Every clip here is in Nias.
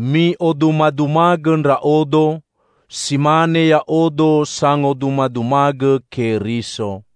Mi'odumadumagõ ndra'odo, si mane ya'odo sangodumadumagõ Keriso.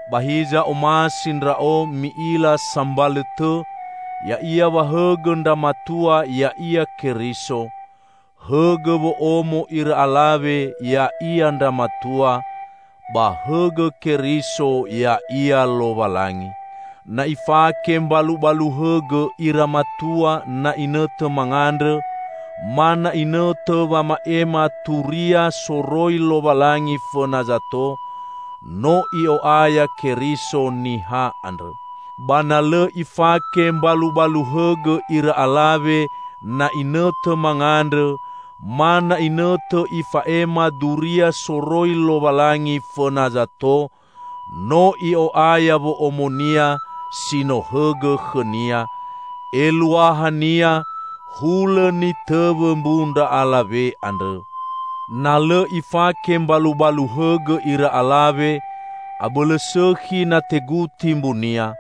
Ba hiza omasi ndra'o mi'ila sambalõ tõ, ya'ia wa hõgõ ndra matua ya'ia Keriso; hõgõ wo'omo ira alawe ya'ia ndra matua, ba hõgõ Keriso ya'ia Lowalangi. Na ifake mbalubalu hõgõ ira matua na inõtõ mangandrõ ma na inõtõ wama'ema turia soroi Lowalangi fõna zato, no i'o'aya Keriso niha andrõ. Ba na lõ ifake mbalubalu hõgõ ira alawe na inõtõ mangandrõ ma na inõtõ ifa'ema duria soroi Lowalangi fõna zato, no i'o'aya wo'omonia si no hõgõ khõnia. Eluahania hulõ nitõwõ mbu ndra alawe andrõ. Na lõ ifake mbalubalu hõgõ ira alawe, abõlõ sõkhi na teguti mbunia.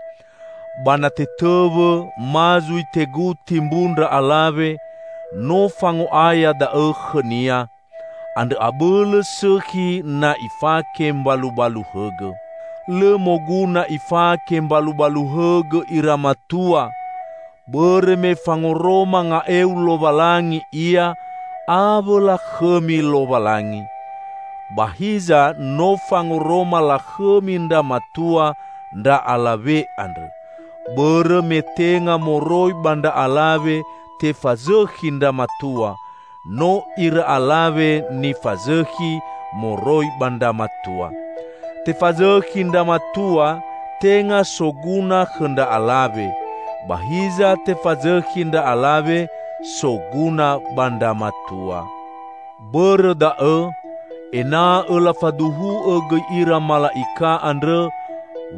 Ba na tetõwõ ma zui teguti mbu ndra alawe, no fango'aya da'õ khõnia. Andrõ abõlõ sõkhi na ifake mbalubalu hõgõ. Lõ moguna ifake mbalubalu hõgõ ira matua, bõrõ me fangoroma nga'eu Lowalangi ia awõ lakhõmi Lowalangi. Ba hiza no fangoroma lakhõmi ndra matua ndra alawe andrõ, bõrõ me tenga moroi ba ndra alawe tefazõkhi ndra matua, no ira alawe nifazõkhi moroi ba ndra matua. Tefazõkhi ndra matua tenga soguna khõ ndra alawe, ba hiza tefazõkhi ndra alawe soguna ba ndra matua. Bõrõ da'õ, ena'õ lafaduhu'õ gõi ira mala'ika andrõ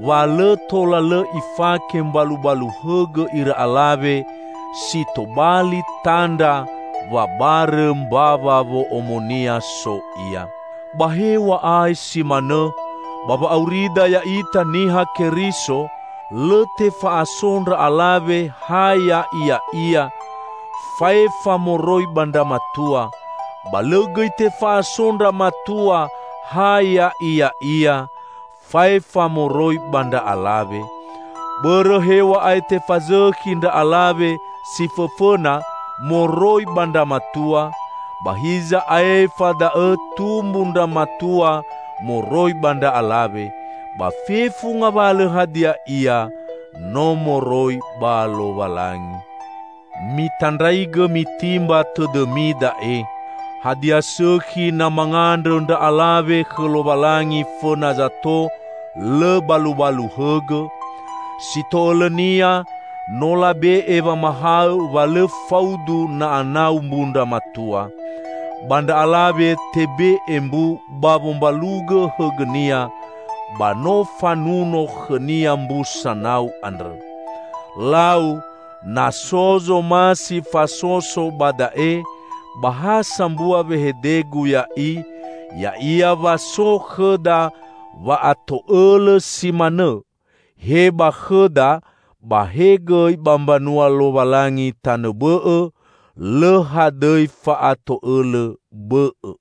wa lõ tola lõ ifake mbalubalu hõgõ ira alawe, si tobali tandra wa barõ mbawa wo'omonia so ia. Ba hew̃a'ae si manõ, ba wa'aurida ya'ita Niha Keriso, lõ tefa'aso ndra alawe ha ya'iya'ia, faefa moroi ba ndra matua, ba lõ gõi tefa'aso ndra matua ha ya'iya'ia, faefa moroi ba ndra alawe. Bõrõ hew̃a'ae tefazõkhi ndra alawe si fõfõna moroi ba ndra matua, ba hiza aefa da'õ tumbu ndra matua moroi ba ndra alawe; ba fefu ngawalõ hadia ia no moroi ba Lowalangi. Mitandraigõ mitimba tõdõmi da'e: Hadia sõkhi na mangandrõ ndra alawe khõ Lowalangi fõna zato, lõ balubalu hõgõ? Si to'õlõnia, no labe'e wamahaõ wa lõ faudu na anau mbu ndra matua. Ba ndra alawe tebe'e mbu ba wombalugõ hõgõnia, ba no fanuno khõnia mbu sanau andrõ. Lau, na so zomasi fasoso ba da'e, ba ha sambua wehedegu ya'i, ya'ia wa so khõda wa'ato'õlõ si manõ, he ba khõda ba he gõi ba mbanua Lowalangi tanõ bõ'õ; lõ hadõi fa'ato'õlõ bõ'õ.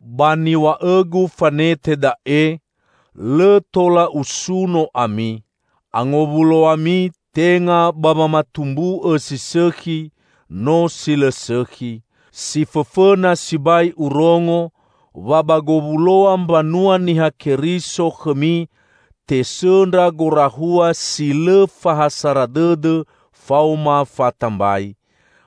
Ba niw̃a'õgu fanete da'e, lõ tola usuno ami. Angowuloami tenga ba wamatumbu'õ si sõkhi, no si lõ sõkhi. Si fõfõna sibai urongo, wa ba gowuloa mbanua Niha Keriso khõmi tesõndra gorahua si lõ fa ha sara dõdõ faoma fatambai.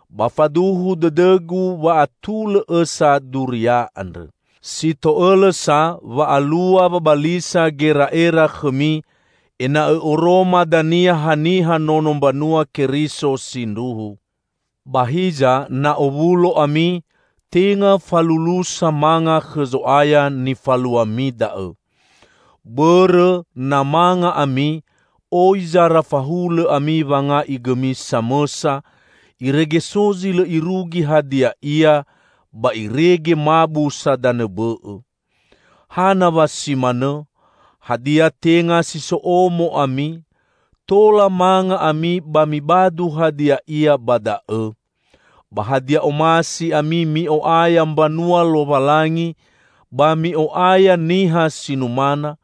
Ba faduhu dõdõgu wa atulõ õsa duria andrõ. Si to'õlõ sa wa alua wabalisa gera'era khõmi, ena'õ oroma dania haniha nono mbanua Keriso sindruhu. Ba hiza, na owulo ami, tenga falulusa manga khõ Zo'aya nifaluami da'õ. Bõrõ, na manga ami, oi zara fahulõ ami wanga'i gõmi samõsa, irege so zi lõ irugi hadia ia, ba irege mabu sa danõ bõ'õ. Hana wa si manõ? Hadia, tenga si so omo ami? Tola manga ami ba mibadu hadia ia ba da'õ! Ba hadia omasi ami mi'o'aya mbanua Lowalangi ba mi'o'aya niha si numana?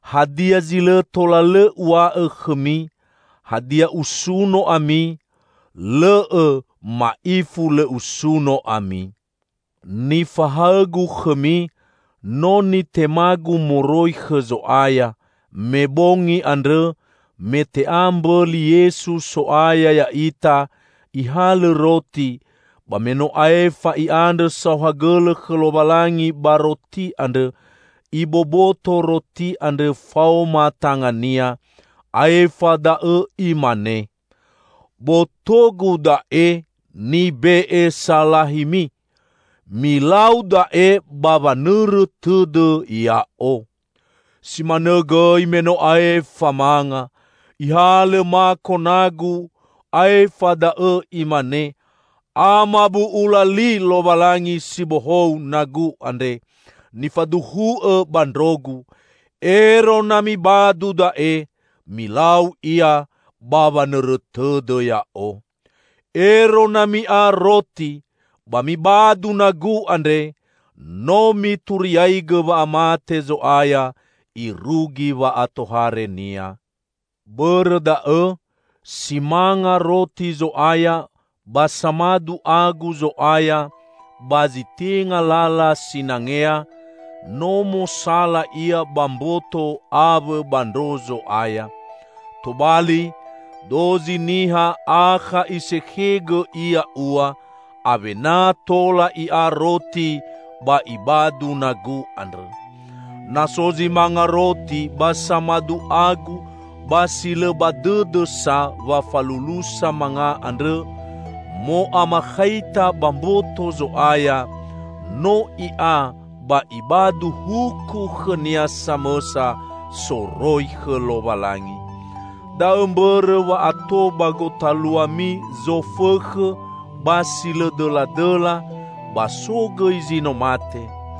Hadia zi lõ tola lõ uw̃a'õ khõmi? Hadia, usuno ami? Lõ'õ! Ma'ifu lõ usuno ami. Nifahaõgu khõmi, no nitemagu moroi khõ Zo'aya: me bongi andrõ, me te'a mbõli, Yesu, So'aya ya'ita, Ihalõ roti, ba me no aefa I'andrõ saohagõlõ khõ Lowalangi ba roti andrõ, Iboboto roti andrõ faoma tanga-Nia, aefa da'õ Imane, "Boto-Gu da'e, nibe'e salahimi. Milau da'e ba wanõrõ tõdõ Ya'o." Si manõ gõi me no aefa manga, Ihalõ mako nagu aefa da'õ Imane, "Amabu'ula li Lowalangi si bohou nagu andre, nifaduhu'õ ba ndro-Gu. Ero na mibadu da'e, milau ia ba wanõrõ tõdõ Ya'o." Ero na mi'a roti ba mibadu nagu andre, no mituriaigõ wa'amate Zo'aya, irugi wa'atohare-Nia. Bõrõ da'õ, si manga roti Zo'aya ba samadu agu Zo'aya ba zi tenga lala sinangea, no mosala ia ba mboto awõ ba ndro Zo'aya. Tobali, dozi niha akha isekhegõ ia ua, awena tola i'a roti ba ibadu nagu andrõ. Na so zi manga roti ba samadu agu ba si lõ ba dõdõ sa wa falulusa manga andrõ mo'amakhaita ba mboto Zo'aya, no i'a ba ibadu huku khõnia samõsa soroi khõ Lowalangi. Da'õ mbõrõ wa ato ba gotaluami zofõkhõ ba si lõ dõladõla, ba so gõi zi no mate.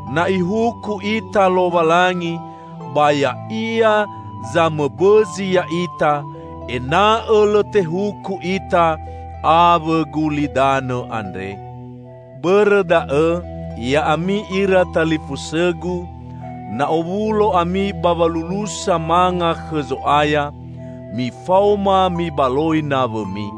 Na Ihuku ita Lowalangi, ba Ya'ia zamõbõzi ya'ita, ena'õ lõ tehuku ita awõ gulidanõ andre. Bõrõ da'õ, ya'ami ira talifusõgu, na owulo ami ba walulusa manga khõ Zo'aya, mifaoma mibaloi nawõmi.